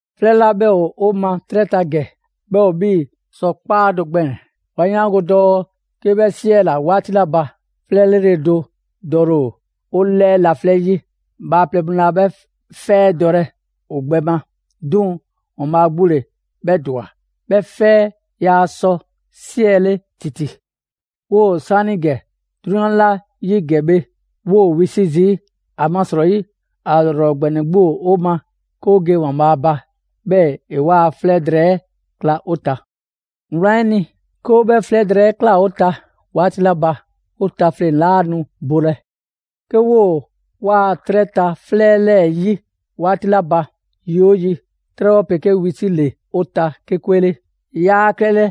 'Flɛ 'la 'bhɛ ‑o 'o ma 'trɛ ta ‑gɛ, 'bhɛ ‑o 'bhii‑ sɔ 'kpaa do gbɛɛn‑. 'Wa 'yaango‑ dɔɔ 'ke 'bhɛ 'siɛla‑ 'waati 'la ba, 'fɛ 'lrele‑ do dɔle ‑o 'o 'lɛɛ laflɛ' 'yi. Bhaaplɛŋ mu laa 'bhɛ 'fɛ 'ɛ dɔlɛ ‑o gbɛ 'le. 'Duŋ‑ ‑Waanbhaa' 'gbu ‑le 'bhɛ ‑dwa. 'Bhɛ 'fɛ 'ɛ yaa sɔ 'siɛle ‑titi. 'Woo‑ 'saanigɛ 'drunyan 'la 'yi ‑gɛ bhe, 'woo wisi' zii', ‑amasrɔyi ‑a ‑lrɔ ‑gbɛnɛ 'gbu ‑o 'o ma 'ke 'o ge ‑Waanbhaa' ba, 'bhɛɛ‑ ‑e 'waa‑ 'flɛ drɛɛ 'ɛ kla 'o ta. Wlan 'ɛ ni, 'ke 'o 'bhɛ 'flɛ drɛɛ ꞊klaa 'o ta 'waati 'la ba, 'o tafleŋ‑ 'laa nu bolɛ. 'Ke 'woo 'waa‑ 'trɛ ta 'flɛ 'lɛɛ‑ 'yi 'waati 'la ba, yi 'oo yi 'trɛbhɔ 'pegee wisile ‑le 'o ta 'ke 'kwe 'le. Yaa klɛlɛ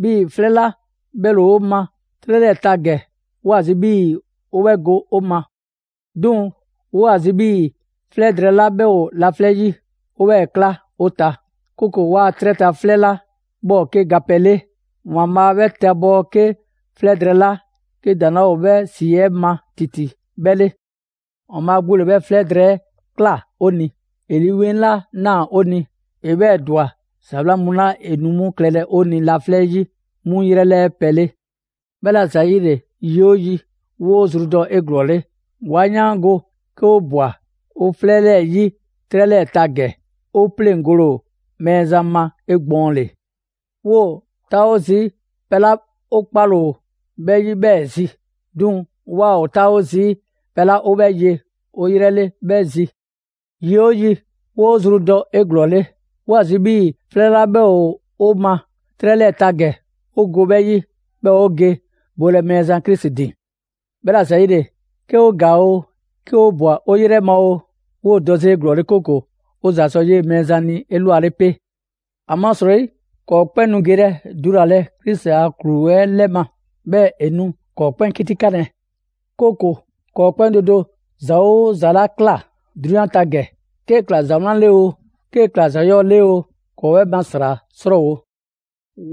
'bhii‑ 'flɛ 'la 'bhɛ ‑le 'o ma 'trɛ 'lɛɛ‑ ta ‑gɛ, 'woo‑ ‑a zi 'bhii‑ 'o 'bhɛ go 'o ma. 'Duŋ‑ 'woo ‑a zi 'bhii‑ 'flɛ drɛɛ 'la 'bhɛ ‑o laflɛ' 'yi, 'o 'bhɛɛ‑ kla 'o ta; 'kooko‑ 'waa‑ 'trɛ ta 'flɛ 'la 'bhɛ ‑o 'ke gapɛ 'le, ‑Waanbhaa' 'bhɛ tabɔɔ 'ke 'flɛ drɛɛ 'la 'ke ‑daŋ' 'laa ‑o 'bhɛ 'si 'ɛ ma ‑titi 'bhɛ 'le. ‑Waanbhaa' 'gbu ‑le 'bhɛ 'flɛ drɛɛ 'ɛ ꞊kla 'o ni. ‑E Lii 'Weŋ 'la ꞊naa 'o ni, ‑e 'bhɛɛ‑ ‑dwa ‑za 'wlan mu 'la ‑e nu 'mu klɛlɛ 'o ni laflɛ' 'yi, 'mu 'yrɛ 'lɛɛ pɛ le. 'Bhɛla‑ ‑zayile, yi oo yi, 'woo zru dɔ 'eglɔɔle. 'Wa 'yaango‑ 'ke 'o ꞊bwa 'o 'flɛ 'lɛɛ‑ 'yi 'trɛ 'lɛɛ‑ ta ‑gɛ, 'o 'pleŋgole ‑o Mɛɛzan ma 'egbɔɔnle. 'Woo‑ 'taawo zii' pɛ 'la 'o 'kpale‑ ‑o 'bhɛ 'yi 'bhɛɛ‑ zi, 'duŋ‑ 'waa‑ ‑o 'taawo zii' pɛ 'la 'o 'bhɛ ye 'o 'yrɛ 'le 'bhɛ zi. Yi 'oo yi, 'woo‑ zru dɔ 'eglɔɔle. 'Woo ‑a zi 'bhii‑ 'flɛ 'la 'bhɛ ‑o 'o ma 'trɛ 'lɛɛ‑ ta ‑gɛ, 'o go 'bhɛ 'yi, 'bhɛɛ‑ 'o ge bolɛ Mɛɛzan Krisi ‑din. 'Bhɛla‑ ‑zayile', 'ke 'o ‑gaa oo, 'ke 'o ꞊bwa 'e 'yrɛ ma oo, 'woo‑ dɔ 'zi 'eglɔɔle, 'kooko‑ 'o ‑za sɔ 'yee‑ Mɛɛzan ni 'elwale 'pe. ‑Amasrɔyi ‑kɔɔ' 'kpɛn nu gelɛ dulalɛ Krisi a ‑klu 'ɛ 'lɛ ma, 'bhɛɛ‑ ‑e nu ‑kɔɔ' 'kpɛn 'kitikanlɛ; 'kooko‑ ‑kɔɔ' 'kpɛn do do ‑za 'oo ‑za 'la ꞊kla 'drunyan ta ‑gɛ, 'kee‑ ‑kla ‑za 'wlan 'le oo, 'kee‑ ‑kla ‑za 'yɔɔ‑ 'le oo, ‑kɔɔ' 'bhɛ ma ‑sra 'srɔɔwo‑.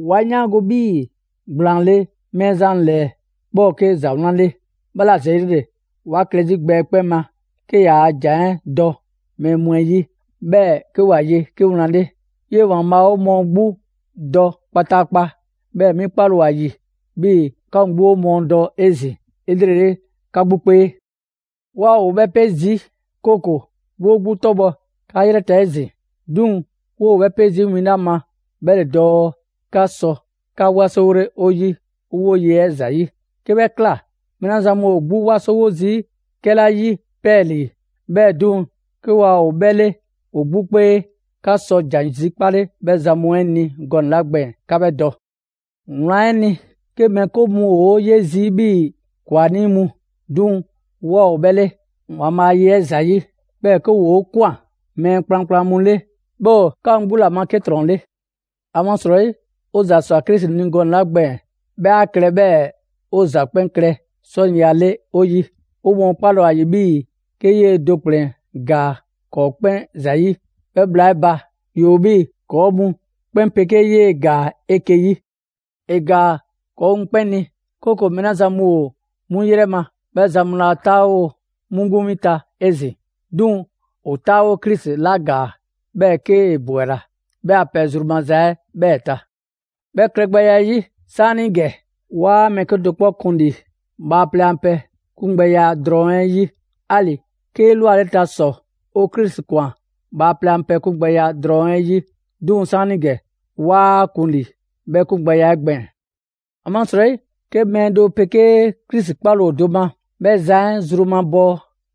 'Wa 'yaango 'bhii‑ ‑gblaanle' Mɛɛzan ‑lɛɛ 'bhɛ ‑o 'ke ‑za 'wlan 'le, 'bhɛla ‑zayile 'wa klɛ 'zi gbɛ 'ɛ 'kpɛn ma 'ke ‑yaa' ‑jan 'ɛ dɔ mɛɛ mu 'ɛ 'yi, 'bhɛɛ‑ 'ke ‑wa ye 'ke wlan 'le. 'Yee‑ ‑Waanbhaa' 'o mɔɔ 'gbu dɔ kpataakpa, 'bhɛɛ‑ 'mi 'kpale‑ ‑o ‑a ‑yi 'bhii‑ 'ka mu 'gbu 'o mɔɔ dɔ 'ezin‑ 'elrele 'ka 'gbu 'kpee. 'Waa ‑o 'bhɛ 'pe zi, 'kooko‑ 'woo 'gbu 'tɔbhɔ‑ 'ka 'yrɛ ta 'ezin‑, 'duŋ‑ 'woo‑ 'bhɛ 'pe zii' win 'la ma 'bhɛ ‑le dɔɔ 'ke 'ka sɔ 'ka 'wasowole 'o 'yi 'o 'woye‑ 'ɛ ‑zayi'. 'Ke 'bhɛ ꞊kla, mɛɛ 'la zan mu ‑o 'gbu 'wasowo zii' 'kɛla 'yi 'pɛɛlii‑, 'bhɛɛ‑ 'duŋ‑, 'ke waa ‑o 'bhɛ 'le ‑o 'gbu 'kpee; 'ka sɔ ‑jan zikpale 'bhɛ zan mu 'ɛ ni gɔnɛ‑ 'la gbɛɛn‑, 'ka 'bhɛ dɔ. Wlan 'ɛ ni, 'ke mɛɛ 'ke mu ‑o 'o 'ye zii' 'bhii‑ ‑kwanii' mu, 'duŋ‑ 'waa ‑o 'bhɛ 'le, ‑Waanbhaa' a ye 'ɛ ‑zayi'. 'Bhɛɛ‑ 'ke ‑woo' ꞊kwan mɛɛ kplankplan mu 'le, 'bhɛ ‑o 'ka mu 'gbu ‑la ma 'ke ‑trɔn 'le. ‑Amasrɔyi 'o ‑za ꞊swa Krisi ni gɔnɛ‑ 'la gbɛɛn‑ 'bhɛ 'a klɛ 'bhɛɛ‑ 'o ‑za 'kpɛn klɛ 'sɔniya 'le 'o 'yi. 'O mɔɔ 'kpale‑ ‑o ‑a ‑yi 'bhii‑ 'ke 'yee‑ do ‑kplɛn ‑gaa ‑kɔɔ' 'kpɛn ‑zayi', 'bhɛ bhla 'ɛ ba, ‑yoo 'bhii‑ ‑kɔɔ' mu 'kpɛn 'pegee 'yee‑ ‑gaa 'eke‑ 'yi. ‑E ‑gaa ‑kɔɔ' mu 'kpɛn ni, 'kooko‑ mɛɛ 'la zan mu ‑o 'mu ‑yrɛ ma, 'bhɛ zan mu 'laa 'taawo 'mu 'gbu win ta 'ezin‑; 'duŋ‑ ‑o 'taawo Krisi 'la ‑gaa, 'bhɛɛ‑ 'kee‑ ‑bwela, 'bhɛ a pɛ zru maza 'ɛ 'bhɛɛ‑ ta. 'Bhɛ klɛgbɛya 'ɛ 'yi 'saanigɛ, 'waa mɛɛ 'kedo‑ 'kpɔ kun ‑li bhaaplɛŋ a pɛ 'kungbɛya drɔŋ 'ɛ 'yi. 'Ali‑ 'ke 'elwaleta ‑sɔ 'o Krisi ‑kwan bhaaplɛŋ a pɛ 'kungbɛya drɔŋ 'ɛ 'yi, 'duŋ‑ 'saanigɛ 'waa‑ kun ‑li 'bhɛ 'kungbɛya 'ɛ gbɛɛn‑. ‑Amasrɔyi 'ke mɛɛ do 'pegee Krisi 'kpale‑ ‑o do ma, 'bhɛ zan 'ɛ zru 'ɛ mabɔɔ,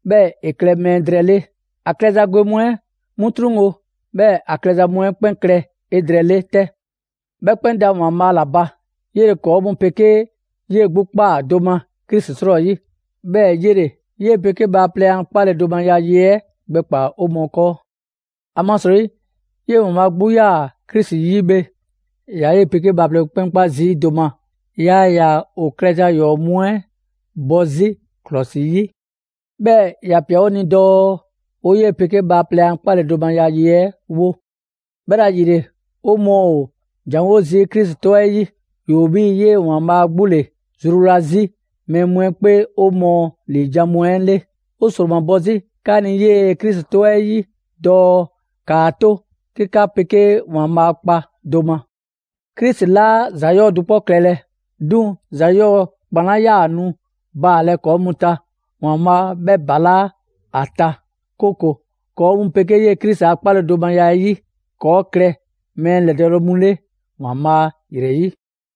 'bhɛɛ‑ ‑e klɛ mɛɛ drɛɛ 'le. ‑A klɛza gwe mu 'ɛ 'mu 'truŋwo‑, 'bhɛɛ‑ ‑a klɛza mu 'ɛ 'kpɛn klɛ 'edrɛɛle 'tɛ. 'Bhɛ 'kpɛn da ‑Waanbhaa' ‑la ba, 'yele‑ ‑kɔɔ' mu 'pegee 'yee‑ 'gbu ꞊kpaa do ma Krisi 'srɔyi. 'Bhɛɛ‑ 'yele‑ 'yee‑ 'pegee bhaaplɛŋ a 'kpaledomaya ye 'ɛ gbɛkpaa‑ 'o mɔɔ 'kɔɔ. ‑Amasrɔyi 'yee‑ ‑Waanbhaa' 'gbu 'yaa‑ Krisi 'yi bhe, ‑e ‑yaa 'yee‑ 'pegee bhaaplɛŋ mu 'kpɛn 'kpa zii' do ma. Yaa ‑yaa ‑o klɛza ‑yɔɔ' mu 'ɛ bɔ 'zi ‑klɔsi 'yi. 'Bhɛɛ‑ ‑ya ‑pia 'o ni dɔɔ 'o 'yee‑ 'pegee bhaaplɛŋ a 'kpaledomaya ye 'ɛ 'wo. 'Bhɛla‑ ‑yile, 'o mɔɔ ‑o ‑janwo' zii' Krisi 'tɔ 'ɛ 'yi. ‑Yoo 'bhii‑ 'yee‑ ‑Waanbhaa' 'gbu ‑le zruwla 'zi mɛɛ mu 'ɛ 'kpee 'o mɔɔ ‑liijan' mu 'ɛ 'le. 'O ‑sromabɔ 'zi 'ka ni 'yee‑ Krisi 'tɔ 'ɛ 'yi dɔɔ ‑kaa 'to 'ke 'ka 'pegee ‑Waanbhaa' kpa do ma. Krisi 'laa ‑za 'yɔɔ‑ do 'kpɔ klɛlɛ, 'duŋ‑ ‑za 'yɔɔ‑ ‑kpan 'la 'yaa‑ nu baalɛ ‑kɔɔ' mu ta, ‑Waanbhaa' 'bhɛ balaa' 'a ta, 'kooko‑ ‑kɔɔ' mu 'pegee 'yee‑ Krisi a 'kpaledomaya 'ɛ 'yi, ‑kɔɔ' klɛ mɛɛ ‑lɛdɔɔle mu 'le ‑Waanbhaa' ‑yrɛ 'yi.